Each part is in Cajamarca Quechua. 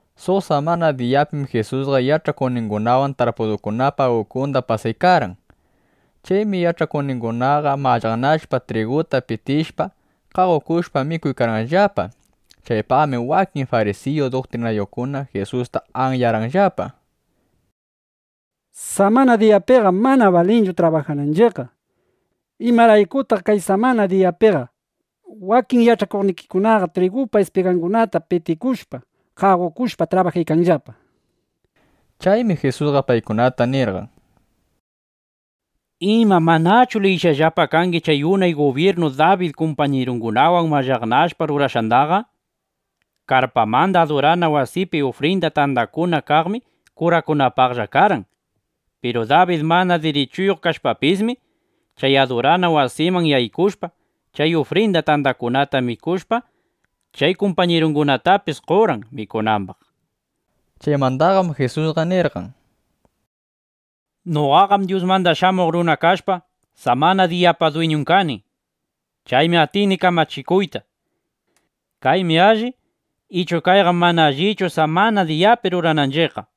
Suq samana diyapim Jisusqa yach'akuqningunawan tarpudukunapa ukunda pasaykarqan. Chaymi yach'akuqningunaqa mallaqnashpa, triguta pitishpa, qaqoshpa, mikuykarqanllapa. Chaypaqmi wakin farisiyu duktrinayuqkuna Jisusta anyarqanllapa: —Samana diyapiqam mana balinchu trabajananchiqqa. ¿Imaraykutaq kay samana diyapi wakin yach'akuqnikiqa trigupa ispigangunata pitikushpa, qaqokushpa trabajaykanllapa? nishpa. Chaymi Jisusqa paykunata nirqan: —Ima, ¿manachu liyishqallapa kangi chay unay gubyirnu Dabid kumpañirungunawan mallaqnashpa rurashqandaqa? Karpamanda adurana wasipi ufrinda tandakuna kaqmi kurakunapaqlla karqan. Piru Dabid mana dirichuyuq kashpapismi, chay adurana wasiman yaykushpa, chay ufrinda tandakunata mikushpa, chay kumpañirungunatapis qorqan mikunambaq. Chaymandaqam Jisusqa nirqan: —Noqaqam Dyusmanda Shamuq Runa kashpa, samana diyapa dwiñun kani. Chaymi atini kamachikuyta: Kaymi alli ichu kayqam mana allichu, samana diyapi rurananchiqqa, nishpa.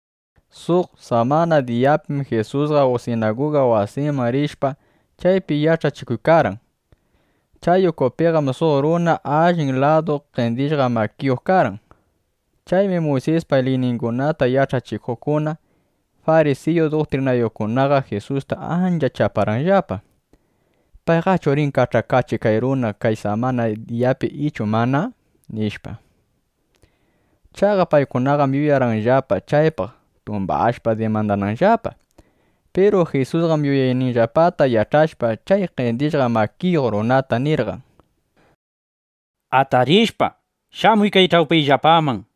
Suq samana diyapim Jisusqa sinaguga wasiman rishpa, chaypi yach'achikuykarqan. Chay ukupiqam suq runa allin ladu qendishqa makiyuq karqan. Chaymi Muysispa liyningunata yach'achikuqkuna, farisiyu duktrinayuqkunaqa Jisusta ancha chaparqanllapa: ¿Payqachu rin kach'akachiq chay runata kay samana diyapi ichu mana? nishpa. Chaqa paykunaqam yuyarqanllapa, chaypaq tumbashpa dimandananllapa. Piru Jisusqam yuyayninllapata yach'ashpa, chay qendishqa makiyuq runata nirqan: —Atarishpa, shamuy kay ch'awpiyllapaman, nishpa.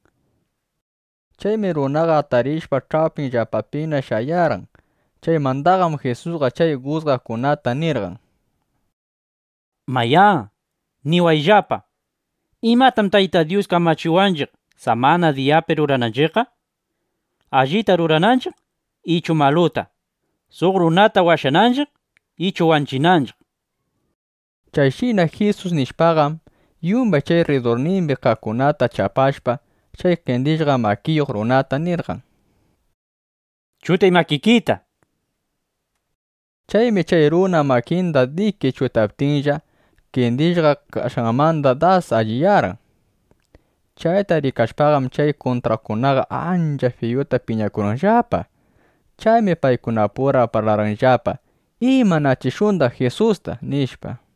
Chaymi runaqa atarishpa ch'awpinllapapina shayarqan. Chaymandaqam Jisusqa chay jusgaqkunata nirqan: —Mayá, niwayllapa: ¿Imatam Tayta Dyus kamachiwanchiq, samana diyapi rurananchiqqa? ¿Allita rurananchiq ichu maluta? ¿Suq runata washananchiq, ichu wanchinanchiq? nishpa. Chayshina Jisus nishpaqam, yumbay chay rridurnimbi kaqkunata chapashpa, chay qendishqa makiyuq runata nirqan: —Chutay makikita, nishpa. Chaymi chay runa makinda diki chutaptinlla, qendishqa kashqanmandaqa dasna allinyarqan. Chayta rikashpaqam, chay kuntraqkunaqa ancha fiyuta piñakurqanllapa. Chaymi paykunapura parlarqanllapa: ¿Imanachishundaq Jisusta? nishpa.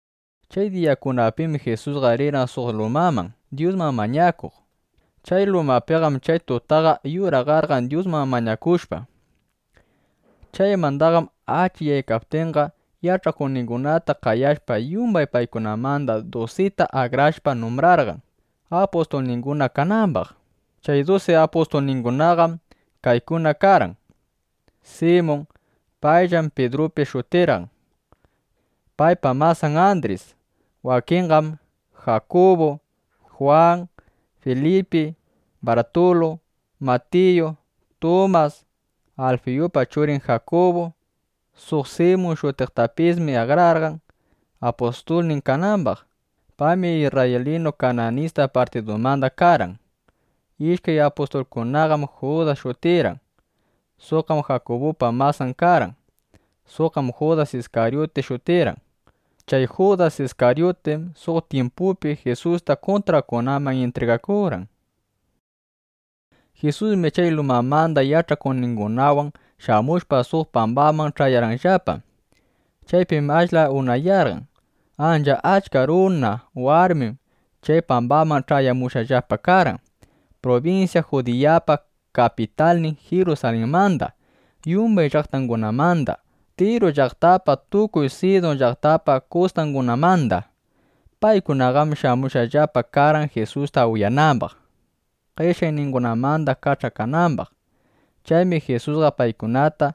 Chay diyakunapim Jisusqa rirqan suq lumaman Dyusman mañakuq. Chay lumapiqam chay tutaqa yuraqarqan Dyusman mañakushpa. Chaymandaqam achikyaptinqa, yach'akuqningunata qayashpa, yumbay paykunamanda dusita akrashpa numbrarqan, apustulninguna kanambaq. Chay dusi apustulningunaqam kaykuna karqan: Simun; payllam Pidrupis shutirqan; paypa masan Andris; wakinqam Jakubu, Jwan, Filipi, Bartulu, Matiyu, Tumas, Alfiyupa churin Jakubu. Suq Simun shutiqtapismi akrarqan, apustulnin kanambaq. Paymi isrraylinu Kananista partidumanda karqan. Ishkay apustulkunaqam Judas shutirqan. Suqqam Jakubupa masan karqan. Suqqam Judas Iskaryuti shutirqan. Chay Judas Iskaryutim suq tyimpupi Jisusta kuntraqkunaman intrigakurqan. Jisusmi chay lumamanda yach'akuqningunawan shamushpa, suq pambaman ch'ayarqanllapa. Chaypim ashla unayarqan. Ancha achka runa, warmim chay pambaman ch'ayamushqallapa karqan prubinsya Judiyapa kapitalnin Jirusalinmanda, yumbay llaqtangunamanda, Tiru llaqtapa, tukuy Sidun llaqtapa kustangunamanda. Paykunaqam shamushqallapa karqan Jisusta uyanambaq, qeshyayningunamanda kach'akanambaq. Chaymi Jisusqa paykunata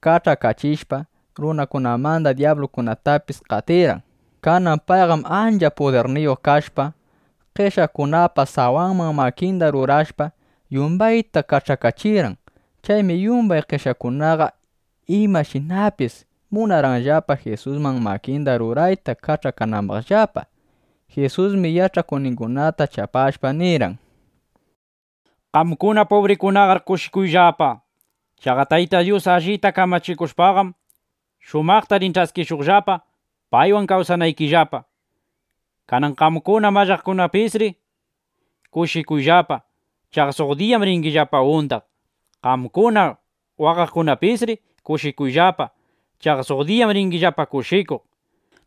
kach'akachishpa, runakunamanda dyablukunatapis qatirqan. Kanan payqam ancha pudirniyuq kashpa, qeshyaqkunapa sawanman makinda rurashpa, yumbayta kach'akachirqan. Chaymi yumbay qeshyaqkunaqa imashinapis munarqanllapa Jisusman makinda rurayta kach'akanambaqllapa. Jisusmi yach'akuqningunata chapashpa nirqan: —Qamkuna pubrikunaqar kushikuyllapa. Chaqa Tayta Dyus allita kamachikushpaqam, shumaqta rin ch'askishuqllapa, paywan kawsanaykillapa. ’Kanan qamkuna mallaqnaqkunapisri kushikuyllapa. Chaqa suq diyaqam ringillapa undaq. Qamkuna waqaqkunapisri kushikuyllapa. Chaqa suq diyaqam ringillapa kushikuq.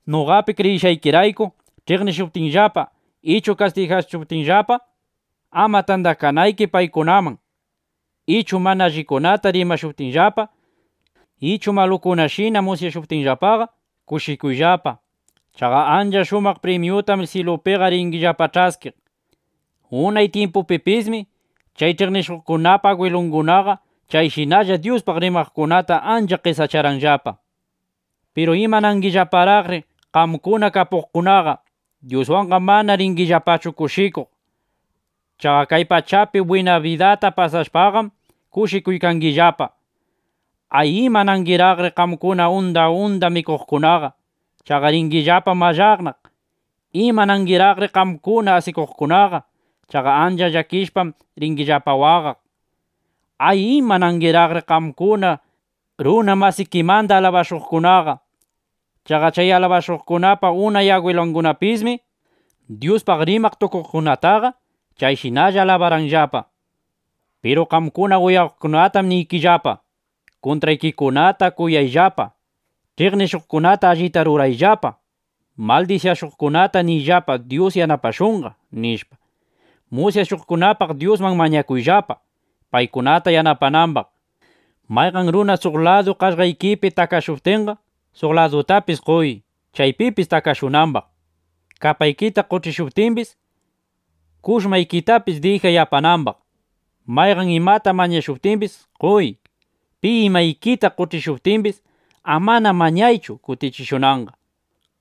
’Noqapi kriyishqaykirayku ch'iqnishuptinllapa ichu qatishuptinllapa ama tandakanayki paykunaman, ichu mana allikunata rimashuptinllapa, ichu malukunatashina musyashuptinllapaqa, kushikuyllapa. Chaqa ancha shumaq primyutam syilupiqa ringillapa ch'askiq. Unay tyimpupipismi chay ch'iqnishuqkunapa agwilungunaqa chayshinalla Dyuspaq rimaqkunata ancha qesacharqanllapa. ’Piru ¡imanangillaparaqri qamkuna kapuqkunaqa! Dyuswanqam mana ringillapachu kushikuq. Chaqa kay pachapi bwina bidata pasashpaqam kushikuykangillapa. ’¡Ay, imanangiraqri qamkuna unda unda mikuqkunaqa! Chaqa ringillapam mallaqnaq. ¡Imanangiraqri qamkuna asikuqkunaqa! Chaqa ancha llakishpam, ringillapa waqaq. ’¡Ay, imanangiraqri qamkuna, runa masikimanda alabashqakunaqa! Chaqa chay alabashuqkunapa unay agwilungunapismi Dyuspaq rimaq tukuqkunataqa chayshinalla alabarqanllapa. ’Piru qamkuna uyawaqkunatam niykillapa, kuntraykikunata kuyayllapa. Ch'iqnishuqkunata allita rurayllapa. Maldisyashuqkunata niyllapa: “Dyus yanapashunqa”, nishpa. Musyashuqkunapaq Dyusman mañakuyllapa, paykunata yanapanambaq. Mayqan runa suq ladu qaqllaykipi takashuptinqa, suq ladutapis qoy, chaypipis takashunambaq. Kapaykita qoch'ishuptimbis, kushmaykitapis dijay apanambaq. Mayqan imata mañashuptimbis, qoy. Pi imaykita qoch'ishuptimbis, amana mañaychu kutichishunanqa.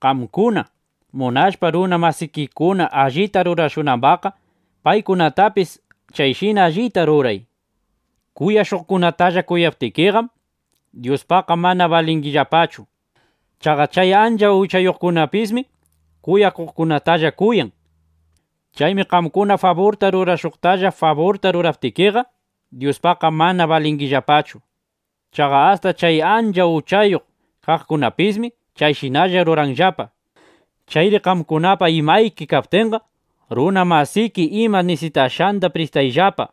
Qamkuna munashpa runa masikikuna allita rurashunambaqqa, paykunatapis chayshina allitalla ruray. ’Kuyashuqkunatalla kuyaptikiqam, Dyuspaqqa mana balingillapachu. Chaqa chay ancha uchayuqkunapismi kuyaqkunatalla kuyan. Chaymi qamkuna faburta rurashuqtalla faburta ruraptikiqa, Dyuspaqqa mana balingillapachu. Chaqa asta chay ancha uchayuq kaqkunapismi chayshinalla ruranllapa. (Chayri qamkunapa imayki kaptinqa, runa masiki ima nisitashqanda pristayllapa.)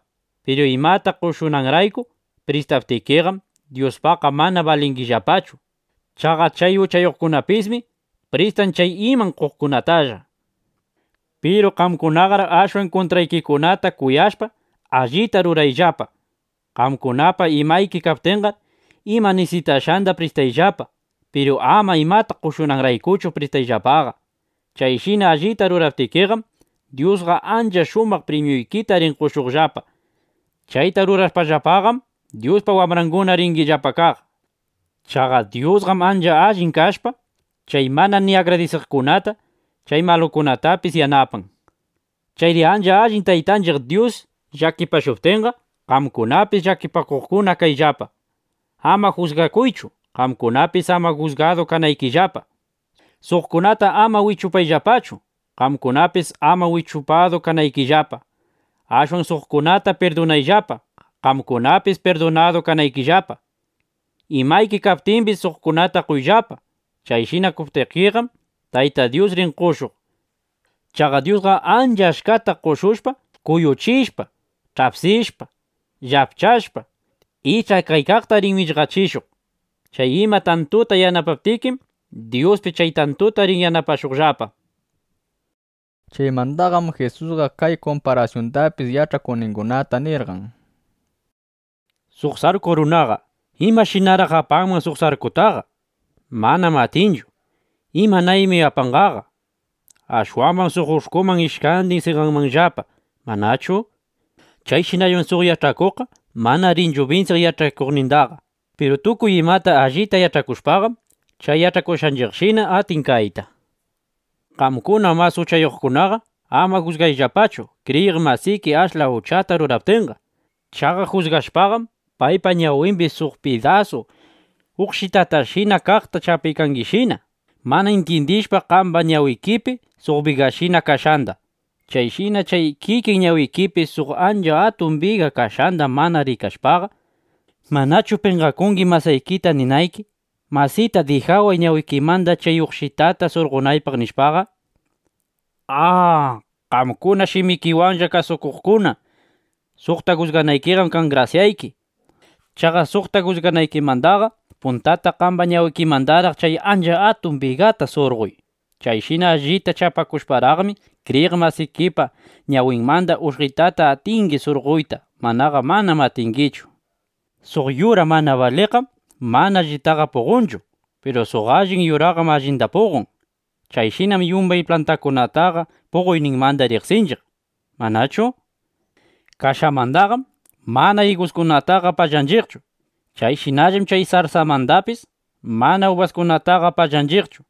Piru imata qoshunanrayku pristaptikiqam, Dyuspaqqa mana balingillapachu. Chaqa chay uchayuqkunapismi pristan chay iman qoqkunatalla. Piru qamkunaqar ashwan kuntraykikunata kuyashpa, allita rurayllapa. Qamkunapa imayki kaptinqar, ima nisitashqanda pristayllapa. Piru ama imata qoshunanraykuchu pristayllapaqa. Chayshina allita ruraptikiqam, Dyusqa ancha shumaq primyuykita rin qoshuqllapa. Chayta rurashpallapaqam, Dyuspa wambranguna ringillapa kaq. Chaqa Dyusqam ancha allin kashpa, chay mana ni agradisiqkunata, chay malukunatapis yanapan. Chayri ancha allin Taytanchiq Dyus llakipashuptinqa, qamkunapis llakipakuqkuna kayllapa. ’Ama jusgakuychu, qamkunapis ama jusgadu kanaykillapa. Suqkunata ama wichupayllapachu, qamkunapis ama wichupadu kanaykillapa. Ashwan suqkunata pirdunayllapa, qamkunapis pirdunadu kanaykillapa. Imayki kaptimbis, suqkunata qoyllapa. Chayshina qoptikiqam, Tayta Dyus rin qoshuq. Chaqa Dyusqa ancha achkata qoshushpa, kuyuchishpa, ch'apsishpa, llapchashpa, ich'akaykaqta rin millqachishuq. Chay ima tantuta yanapaptikim, Dyuspis chay tantuta rin yanapashuqllapa, nishpa. Chaymandaqam Jisusqa kay kumparasyundapis yach'akuqningunata nirqan: —Suq sarku runaqa ¿imashinaraq apanman suq sarkutaqa? Manam atinchu. ¿Imanaymi apanqaqa? Ashwambam suq ush'kuman ishkandin seqanmanllapa, ¿manachu? Chayshinallam suq yach'akuqqa mana rinchu binsiq yach'achikuqnindaqa. Piru tukuy imata allita yach'akushpaqam, chay yach'achikuqninshina atin kayta. ’Qamkuna mas uchayuqkunaqa ama jusgayllapachu, kriyiq masiki ashla uchata ruraptinqa. Chaqa jusgashpaqam, paypa ñawimbi suq pidasu uqshitashina kaqta chapaykangishina, mana intyindishpa qamba ñawikipi suq bigashina kashqanda. Chayshina chay kikin ñawikipi suq ancha atun biga kashqanda mana rikashpaqa, ¿manachu penqakungi masaykita ninayki: “Masita, dijaway ñawikimanda chay uqshitata surqonaypaq” nishpaqa? ¡A, qamkuna shimikiwanlla kasukuqkuna! ¡Suqta jusganaykiqam kan grasyayki! ¡Chaqa suqta jusganaykimandaqa puntata qamba ñawikimandaraq chay ancha atun bigata surqoy! Chayshina allita chapakushparaqmi, kriyiq masikipa ñawinmanda uqshitataqa atingi surqoyta. Manaqa manam atingichu, nishpa. ’Suq yura mana baliqqam mana allitaqa puqonchu. Piru suq allin yuraqam allinda puqon. Chayshinam yumbay plantakunataqa puqoyninmanda riqsinchiq, ¿manachu? Kashamandaqam mana iguskunataqa pallanchiqchu. Chayshinallam chay sarsamandapis mana ubaskunataqa pallanchiqchu.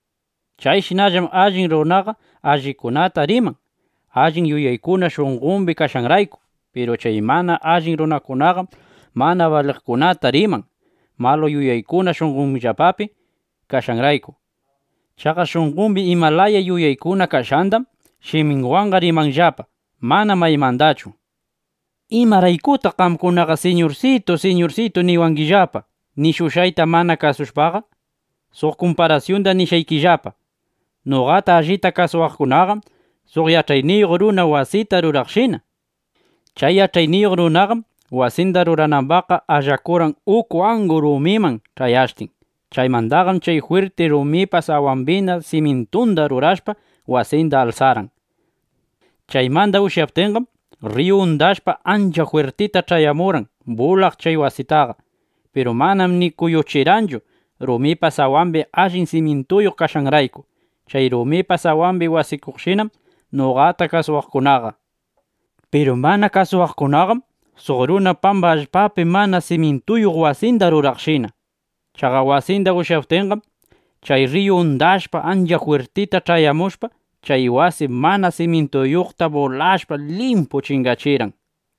Chayshinallam allin runaqa allikunata riman, allin yuyaykuna shunqombi kashqanrayku. Piru chay mana allin runakunaqam mana baliqkunata riman, malu yuyaykuna shunqonllapapi kashqanrayku. Chaqa shunqombi ima laya yuyaykuna kashqandam shiminwanqa rimanllapa; manam maymandachu. ’¿Imaraykutaq qamkunaqa “Siñursitu, Siñursitu” niwangillapaqa, nishushqayta mana kasushpaqa? Suq kumparasyunda nishqaykillapa. Noqata allita kasuwaqkunaqam suq yach'ayniyuq runa wasita ruraqshina. Chay yach'ayniyuq runaqam wasinda ruranambaqqa allakurqan uku angu rumiman ch'ayashtin. Chaymandaqam chay jwirti rumipa sawambina simyintunda rurashpa, wasinda alsarqan. Chaymanda ushyaptinqam, rriyu undashpa, ancha jwirtita ch'ayamurqan bulaq chay wasitaqa. Piru manam ni kuyuchirqanchu, rumipa sawambi allin simyintuyuq kashqanrayku. Chay rumipa sawambi wasikuqshinam noqata kasuwaqkunaqa. Piru mana kasuwaqkunaqam suq runa pamba allpapi mana simyintuyuq wasinda ruraqshina. Chaqa wasinda ushyaptinqam, chay rriyu undashpa, ancha jwirtita ch'ayamushpa, chay wasi mana simyintuyuqta bulashpa, limpu chingachirqan, nishpa.